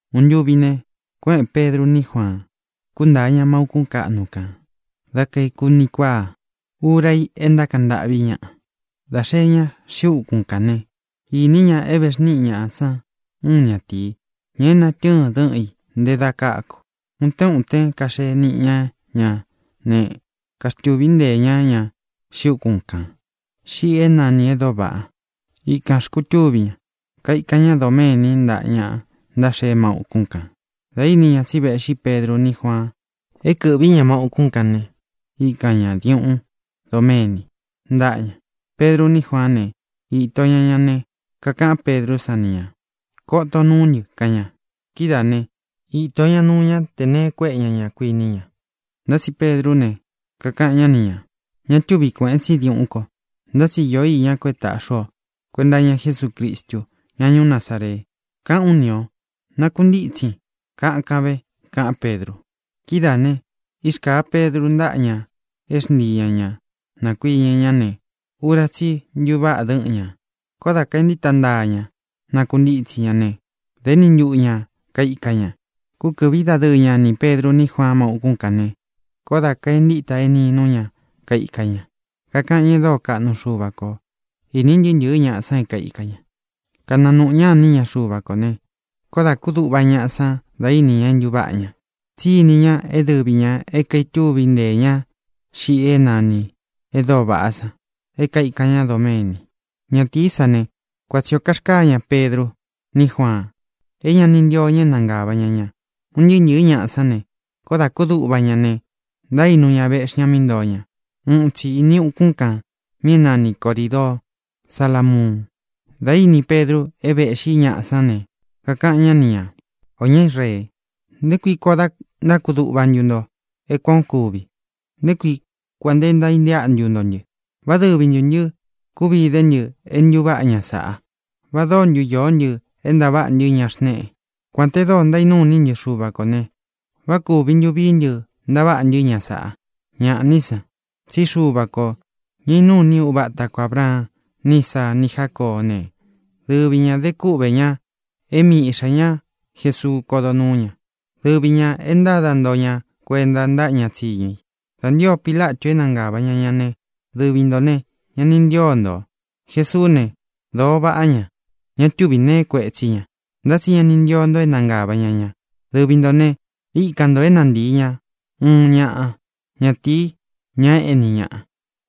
Uun ntuvi ne, kuéꞌēn Pedru ní Juaan, kuntáa ña má ūkún kaꞌnu kān dá kaeku uni kuáa, ura i é ntákaꞌan ntâꞌvi ñáꞌa. Dā xee ña xiꞌi úkun kán ne, īní ña é vēxníꞌi ñaꞌa san uun ñátīi, ña é natɨ́ɨn dɨꞌɨn i nté dā káku. Utén utén kaxee niꞌi ña ña ne, kaxtúvi nteē ñá ña xiꞌi úkun kān, xiꞌi é nanī E Dóo Vaꞌa. Ikān xkutúvi ñá, kaikan ñá doméni ntaꞌa ña ntáxee má ūkún kān. Dā íni ña tsí véꞌxi Pedru ní Juaan é kɨ̄ꞌvi ña má ūkún kān ne, íkan ñā diuꞌún doméni ntaꞌa ña. Pedru ní Juaán ne, īto ña ña ne, kakaꞌán Pedrú san ni ñā: —Koton nuú ntɨ —kaꞌan ña. Kidáā né, īto ñá nuu ña tē nee kuéꞌe ña ña, kuiní ña. Ntá tsi Pedrú ne, kakaꞌan ñá ni ñā: —Ña túvi kuēꞌen tsí diuꞌún ko. Ntá tsi īó iñá ko é tāꞌxi ú o: kuenta iña Jesúcristu, ña ñuú Nazaree, káꞌān ú ni ō: Nakuntítsin, kakan ve —kaꞌán Pedru. Kidáā ne, írkāa Pedru ntáꞌa ña é xntii ña ñā nakuiñɨ ñá ne, ura tsí i ntuváꞌa dɨ́ꞌɨn ñā. Koó dā kaentíta ntaa ña nakuntítsi ña ne, dā éni ntuꞌu ñā kaika ña. Kúkɨ̄ꞌví dadɨɨ ña nī Pedru ní Juaan má ūkún kān ne, koó dā kaentíta eninú ña kaika ña, kakaꞌan ñá e dóo kaꞌnu Xuva kō. Īní ntɨɨ́ ntɨ̄ɨ́ ñaꞌa san é kaika ña, kananuꞌu ñá ini ña Xuva kō ne, koó dā kúduꞌva ñaꞌa san dá ini ña é ntūváꞌa ña, tsí ini ña é dɨvi ñā é kaitúvi nteē ña xiꞌi é nanī E Dóo Vaꞌá san é kaikān ñá doméni. Ñatīí san ne, kuan tsī ó karkaa ña Pedru ní Juaan, é ña ni ntío ña é nangāva ña ña. Un ntɨɨ́ ntɨ̄ɨ́ ñaꞌa sán ne, koó dā kúduꞌva ña ne, ntaínu ñā, véꞌxi ña mí ntoō ñá, uun itsi ini ukun kan mí é nani Corīdoo Salámuun. Dā íni Pedru é véꞌxi ñaꞌa sán ne, kakaꞌan ñá ni ñā: —Ō ñá Israee, ¿nté kui koo da ntákuduꞌva ntu nto é kuan ō kúvi? ¿Nté kui kuān nte ntaíntéꞌa ntu nto ntɨ? ¿Vá dɨvi ntū ntɨ́ kuvi idé ntɨ é ntūváꞌa ña sāꞌa? ¿Va dóo ntu īó ntɨ é ntaváꞌa ntɨ́ ña xnēꞌe? Kuān te dóo ntaínuu ini ntɨ́ Xuva kō ne, ¿vá kūvi ntu vií ntɨ ntaváꞌa ntɨ́ ña sāꞌa? Ñaꞌá ni san, tsí Xuva kō, ña inúu ini uva ata ko Ābraan ni Ísaa ni Jácoó ne, dɨvi ñā de kúꞌvē ñá é mii iꞌxā ñá Jesuu kodó nuū ña. Dɨvi ñā é ntáda nto ña kuenta ntáꞌa ña tsíñu i. Dā ntío Pilatu é nangāva ña ña ne, dɨvi ntō ne, ña ni ntío ntō. Jesuú ne, dōo váꞌa ña. Ña túvi nee kuetsí ña. Ntá tsi ña ni ntio nto é nangāva ña ña. Dɨvi ntō ne, íkan ntō é nantii ña uun ñaꞌa ñatīi, ña éꞌni ñaꞌa.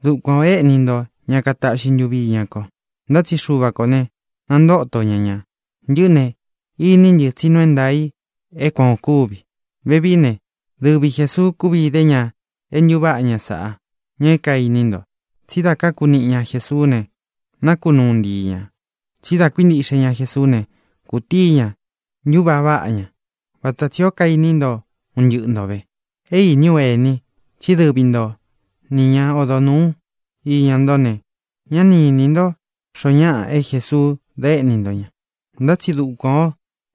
Dukuan ō éꞌni nto ña kataꞌxi ntuvi iña ko. Ntá tsi Xuva kō ne, nantóto ña ña. Ntɨꞌɨ́ ne, iní ntɨ tsí nuu é ntaā i é kuan ō kúvi. Vevií ne, dɨvi Jēsuu kúvi idé ña é ntūváꞌa ña sāꞌá, ña é kainí nto, tsí dá kaku niꞌi ña Jēsuú ne, nakunúu ntii ña. Tsí dá kuíntiꞌxe ña Jesuú ne, kutíi ña ntuvaꞌa váꞌa ña, vata tsi ō kaini ntó un ntɨꞌɨ ntō ve. ʼÉ īní u, ení, tsí dɨvi nto ni ña odo nūú iña nto ne, ña ni ínī ntó xoo ñáꞌa é Jesuu da éꞌni nto ña. Ntá tsi dukuan ō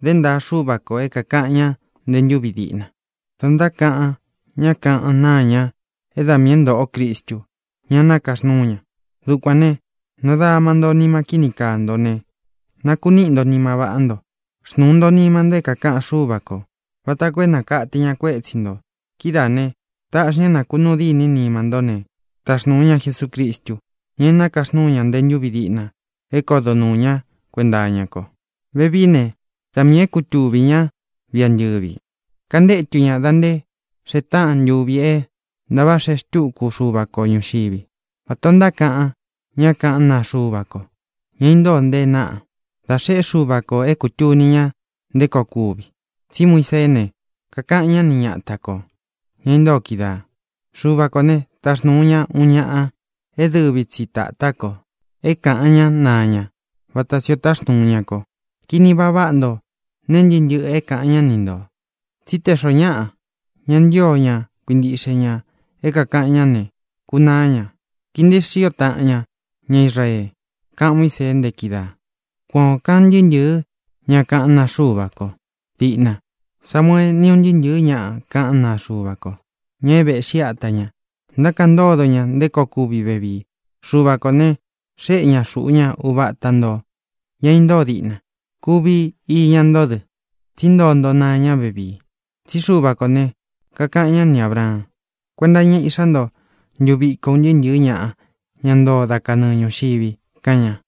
dé ntaa Xuva kō é kākaꞌan ña nté ntūvi diꞌna dá ntákaꞌan ñá kaꞌan naa ña é da miī é ntōꞌo Cristu, ña nakaxnúu ña. Dukuān ne, nadama nto nima kíni kaa nto ne, nakuníꞌi nto nima váꞌá nto. Xnūu nto nima nto é kākaꞌan Xúva kō, vata koo é nākate ña kuétsi ntō. Kidáā ne, taꞌxi ña é nakunuu dîní nima ntó ne, taxnuu ña Jesucristu, ña é nakaxnúu ña nte ntúvi diꞌna é kodo nuū ñá kuenta iña ko. Vevií ne, da miī é kutuvī ñá viꞌi antɨ̄vi, kantétu ña dā nté xee táꞌan ntuvi é ntāvaꞌa xeé xtuku Xuva ko ñūxiví, vatā ó ntákaꞌan ñá kaꞌán naa Xuva ko, ña intóo nte e náꞌa, dá xeꞌé Xuva kō é kūtuni ña nté koo kuvi. Tsí Muiseé ne, kakaꞌan ñá ni ñata kō, ña intóo kídaā: “Xuva kō né, taxnūu ña uun ñaꞌa é dɨvi tsi tātá ko, é kaꞌan ña naa ña, vata tsī o táxnūu ña ko. Kini vaꞌa váꞌa nto nee ntɨ́ꞌɨ ntɨꞌɨ é kāꞌan ñá ni ntō, tsí te xoo ñáꞌa ña ntío ña kuintiꞌxe ña é kākaꞌan ñá ne, kunaá ña. Kii nteé xio taꞌan ña ña Israee”, kaꞌan Muísee nte kídaā. ʼKuan ō kaꞌan ntɨɨ́ ntɨ̄ɨ́ ña kaꞌán naa Xuva ko. Diꞌna Samuee, ni ún ntɨɨ́ ntɨ̄ɨ́ ña kaꞌán naa Xuva ko, ña é vēꞌxí ata ña, ntákaꞌan ntódo ña nté koo kuvi vevii. Xuva kō ne, xéꞌe ña xuꞌu ñá uva ata ntō, ña intóo diꞌna. Kuvi iña ntó dɨ, tsí ntoo nto naa ña vevii. Tsí Xuva kō ne, kakaꞌan ñá ni Ābraan: “Kuenta iña íꞌxá nto ntuviko un ntɨɨ́ ntɨ̄ɨ́ ñaꞌa, ña ntoo dá kanɨɨ ñūxivi”, kaꞌan ña.